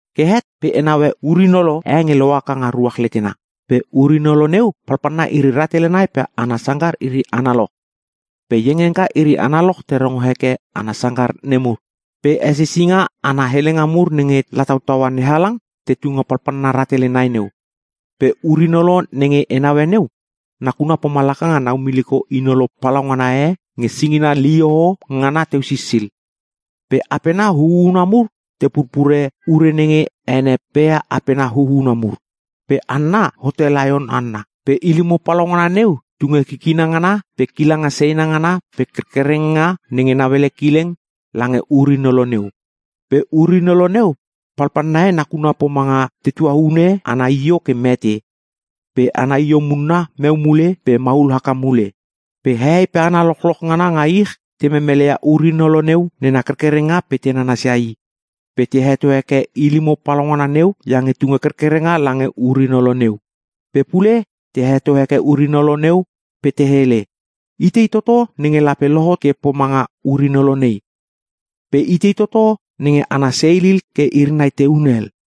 Ke het pe e naue ur-inolo e nge lohaka nga ruach letena. Pe ur-inolo neu palpalna iri rahtele nai pe ana sangkar iri analoch. Pe iengiengka iri analoch te rongo heke ana sangkar nemur. Pe hesisinga ana helenga mur nenge latautaua NeHalang, tetu nga palpalna rahtele nai neu. Pe ur-inolo nenge e naue neu, nakuna pomalaka nga naumiliko inolo palaungana e nenge singina lihoho ngana teu sisil. Pe apena huhuna mur te purpure ure nenge ene pea apena huhuna mur. Pe hanna hote laion hanna. Pe ilimo palaungana neu tunge kikina ngana pe kilanga seina ngana pe kerkerenga nenge nauele kileng, lange ur-inolo neu. Pe ur-inolo neu palpalna e nakuna pomanga tetua hune ana io ke mete, pe ana io munna meu mule pe maul haka mule. Pe hehei pe hana lochloch ngana nga ich te memeleia ur-inolo neu nena kerkerenga pe te nanasia i. Pe te heto heke ilimo palaungana neu iange tunge kerkerenga lange ur-inolo neu. Pe pule te heto heke ur-inolo neu pe te hele, “Itei toto nenge lape lohot ke pomanga ur-inolo nei? Pe itei toto nge ana seilil ke iri nai te hunel?”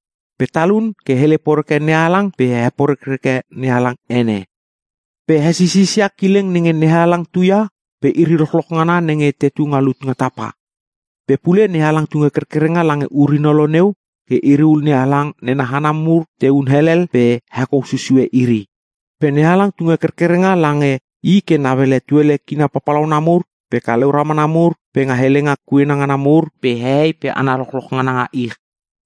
Pe talun ke hele poreke NeHalang pe he porekreke NeHalang ene. Pe he sisisia kileng nenge NeHalang tuia pe iri lochloch ngana nenge tetu nga lut nga tapa. Pe pule NeHalang tunge kerkerenga lange ur-inolo neu ke iriul NeHalang nena hana mur tehun elel pe hekou susue iri. Pe NeHalang tunge kerkerenga lange i ke nauele tuele kina papalauna mur, pe kaleu ramana mur, pe nga helenga kuena ngana mur, pe hehei pe hana lochloch ngana nga ich.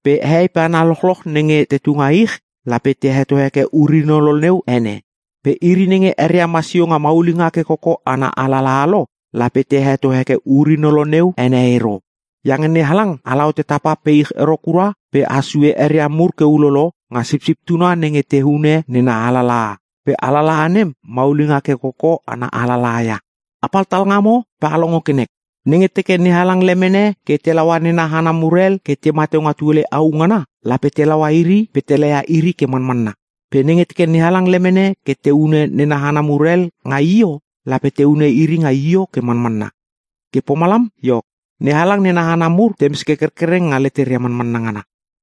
Pe hehei pe hana lochloch nenge te tunga ich, lape te heto heke ur-inolo neu ene. Pe iri nenge eria masio nga maulinga ke koko ana alalaha lo, lape te heto heke ur-inolo neu ene ero. Iange NeHalang ala hote tapa pe ich ero kura pe has sue eria mur ke ulolo nga Sipsip Tuna nenge te hune, nena alalaha. Pe alalaha nem maulinga ke koko ana alalaha ia. Apal talngamo pe a longo ke nek. Nenge teke NeHalang lemene ke te laua nena hana mur hel ke tema teu nga tuele au ngana, lape te laua iri pe te laia iri ke manmanna. Pe nenge teke NeHalang lemene ke te hune nena hana mur hel nga io, lape te hune iri nga io ke manmanna. Ke pomalam iok, NeHalang nena hana mur temes ke kerkereng nga leteria manmanna ngana.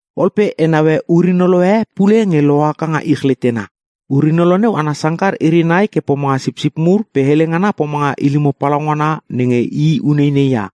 Ol pe e naue ur-inolo e pule nge lohaka nga ich letena. Ur-inolo neu ana sangkar iri nai ke pomanga sipsip mur pe hele ngana pomanga ilimo palaungana nenge i uneinei ia.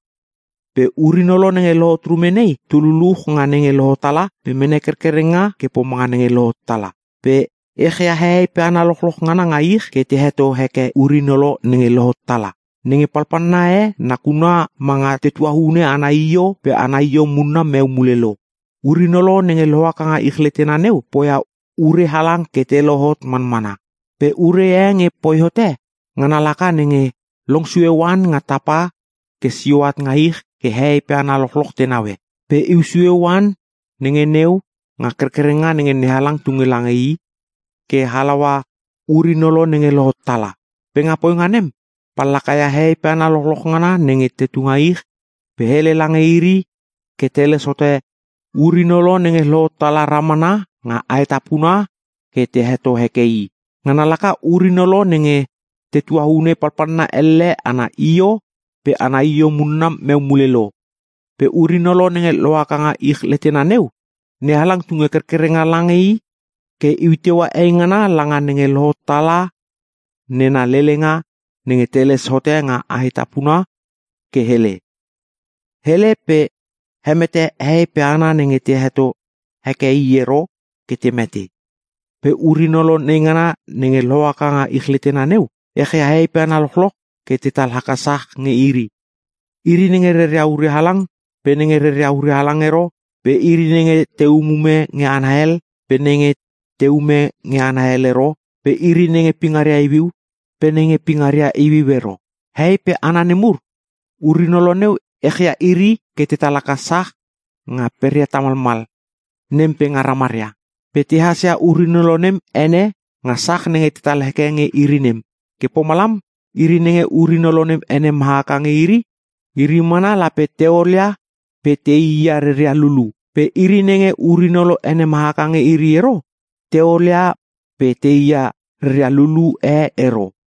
Pe ur-inolo nenge lohot rume nei, tu luluch nga nenge lohot tala pe mene kerkerenga ke pomanga nenge lohot tala. Pe echia hehei pe hana lochloch ngana nga ich ke te heto heke ur-inolo nenge lohot tala. Nenge palpalna e nakuna manga tetua hune ana io pe ana io munna meu mule lo. Ur-inolo nenge lohaka nga ich letena neu poia ure halang ke te lohot manmana. Pe ure e nge poi hote, ngana laka nenge long sue oan nga tapa ke sio at nga ich ke hehei pe hana lochloch te naue. Pe iu sue oan nenge neu nga kerkerenga nenge NeHalang tunge lange i, ke halaua ur-inolo nenge lohot tala. Pe nga poinga nem, pallaka ia hehei pe hana lochloch ngana nenge tetu nga ich pe hele lange iri ke teles hote ur-inolo nenge lohot tala ramana nga aetapuna ke te heto heke i. Ngana laka ur-inolo nenge tetua hune palpalna elle ana io pe ana io munna meu mule lo. Pe ur-inolo nenge lohaka nga ich letena neu, NeHalang tunge kerkerenga lange i ke iu teua eingana langa nenge lohot tala nena lelenga nenge teles hote nga aetapuna ke hele. Hele pe hemete hehei pe hana nenge te heto heke i ero ke te mete. Pe ur-inolo neingana nenge lohaka nga ich letena neu, echia hehei pe hana lochloch ke tetal haka sach nge iri. Iri nenge reria ure halang, pe nenge reria ure halang ero, pe iri nenge te umume nge hana hel, pe nenge teume nge hana hel ero, pe iri nenge pingaria iuiu, pe nenge pingaria iuiu ero. Hehei pe hana nemur, ur-inolo neu echia iri ke tetal haka sach nga peria tamalmal, nem pe nga ramaria. Pe tehas ia ur-inolo nem ene nga sach nenge tetal heke nge iri nem. Ke pomalam iri nenge ur-inolo nem ene mahaka nge iri, iri mana lape te olia pe teia reria lulu. Pe iri nenge ur-inolo ene mahaka nge iri ero te olia pe teia reria lulu e ero.